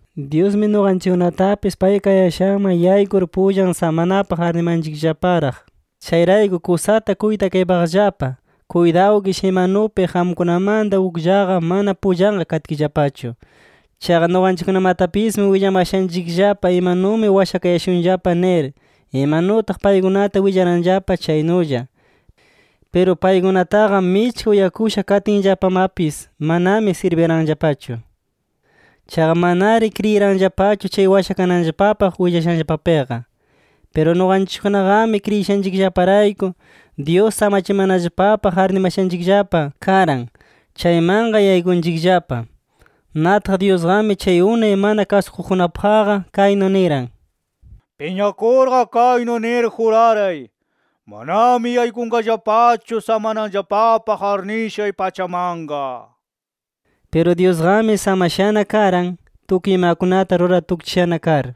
Dyusmi nuqanchikkunatapis pay kayashanman yaykur pullan samanapaq arnimanchikllaparaq. Chayrayku kusata kuytakaypaqllapa. Kuytawkish imanupi qamkunamanta ukllaqa mana pullanqa katkillapachu. Chaqa nuqanchikkunamatapismi willamashanchikllapa imanumi washakayashunllapa nir, imanutaq paykunata willaranllapa chaynulla. Piru paykunataqa michka uyakusha katinllapamapis, manami sirbiranllapachu. Chaqa manari kriyiranllapachu chay washakananllapapaq willashanllapapiqa. Piru nuqanchikkunaqami, kriyishanchikllaparayku Dyus samachimanallapapaq arnimashanchikllapa karan, chaymanqa yaykunchikllapa. Nataq Dyusqami chay unay mana kasukuqkunapaqqa kaynu niran: “Piñakurqa kaynu nir juraray: Manami yaykunqallapachu samananllapapaq arnishay pachamanqa” nir. Piru Dyusqami samashana karan, tukuy imakunata rurar tukchishana kar.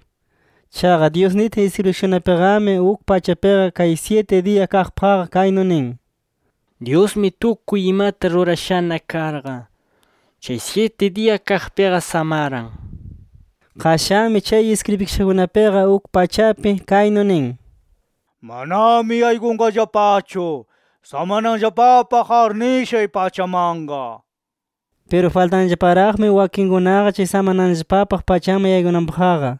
Chaqa Dyus nitin iskribikashakunapiqami, uk pachapiqa chay syiti diya kaqpaqqa kaynu nin: “Dyusmi tukuy imata rurashana karqa, chay syiti diya kaqpiqa samaran” nir. Qashanmi chay iskribikashakunapiqa uk pachapi kaynu nin: “Manami yaykunqallapachu samananllapapaq arnishay pachamanqa” nir. Piru faltanllaparaqmi wakinkunaqa chay samananllapapaq pachaman yaykunanpaqqa.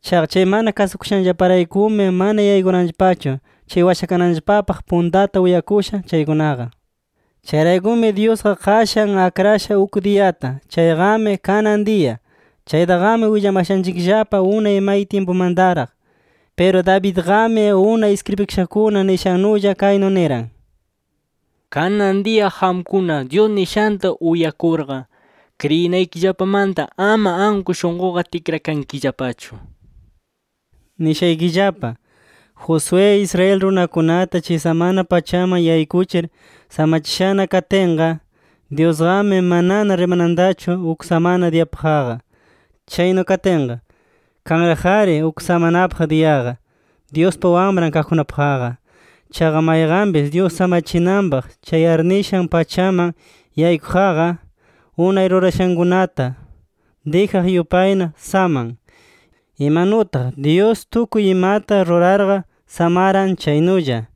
Chaqa chay mana kasukushanllaparaykumi, mana yaykuranllapachu chay washakananllapapaq puntata uyakusha chaykunaqa. Chayraykumi Dyusqa qashan akrasha uk diyata. Chayqami “Kanan diya”. Chaytaqami willamashanchikllapa unay may tyimpumantaraq. Piru Davidqami unay iskribikashakuna nishannulla kaynu niran: “Kanan diya qamkuna, Dyus nishanta uyakurqa, kriyinaykillapamanta ama anku shunquqa tikrakankillapachu” nir. Nishaykillapa: Josué, Israel runakunata chay samana pachaman yaykuchir samachishana katinqa, Dyusqami manana rimanantachu uk samana diyapaqqa. Chaynu katinqa, kanraq-ari uk samanapaq diyaqa, Dyuspa wamran kaqkunapaqqa. Chaqa mayqanpis Dyus samachinanpaq chay arnishan pachaman yaykuqqa, unay rurayashankunata dijaq yupayna saman, imanutaq Dyus tukuy imata rurarqa samaran chaynulla.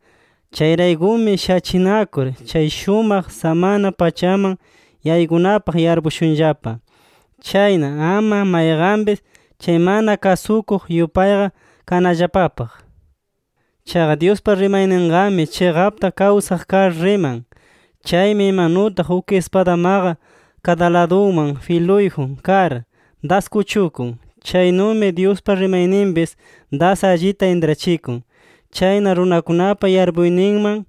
Chayraykumi shachinakur chay shumaq samana pachaman yaykunapaq yarpushunllapa. Chayna ama mayqanpis chay mana kasukuq yupayqa kanallapapaq. Chaqa Dyuspa rimayninqami chiqapta kawsaq kar riman. Chaymi imanutaq uk ispadamaqa kada ladunman filuyjun kar das kuchukun, chaynumi Dyuspa rimayninpis das allita intrachikun. Chayna runakunapa yarpuyninman,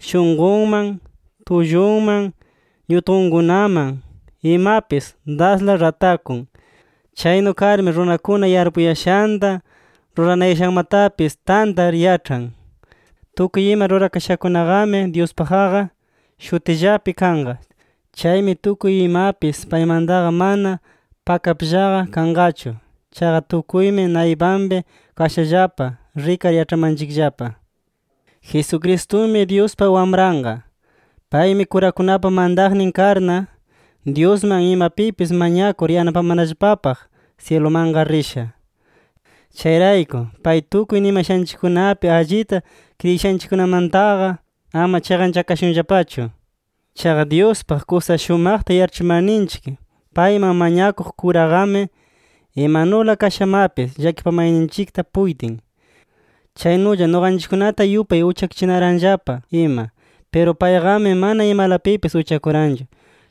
shunqunman, tullunman, ñutqunkunaman imapis dasla ratakun. Chaynu karmi runakuna yarpuyashanta, ruranayashanmatapis tantar yaĉhan. Tukuy ima rurakashakunaqami, Dyuspaqqa shutillapi kanqa. Chaymi tukuy imapis paymantaqa mana pakapllaqa kanqachu. Chaqa tukuymi naypanpi kashallapa, rikar yaĉhamanchikllapa. Jesucristumi Dyuspa Wamranqa. Paymi kurakunapa mantaqnin karna, Dyusman imapipis mañakur yanapamanallapapaq syilumanqa risha. Chayrayku pay tukuy nimashanchikkunapi allita kriyishanchikkunamantaqa, ama chiqanchakashunllapachu. Chaqa Dyuspaq kusa shumaqta yaĉhachimarninchik payman mañakuq kuraqami, imanula kashamapis llakipamayninchikta puytin. Chaynulla nuqanchikkunata yupay uchakuchinaranllapa ima. Piru payqami mana imalapipis uchakuranchu.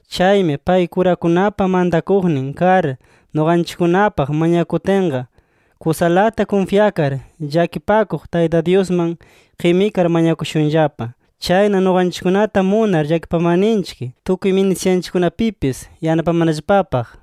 Chaymi pay kurakunapa mantakuqnin kar nuqanchikkunapaq mañakutinqa, kusalata kunfyakar llakipakuq Tayta Dyusman qimikar mañakushunllapa. Chayna nuqanchikkunata munar llakipamarninchik, tukuy ministishanchikkunapipis yanapamanallapapaq.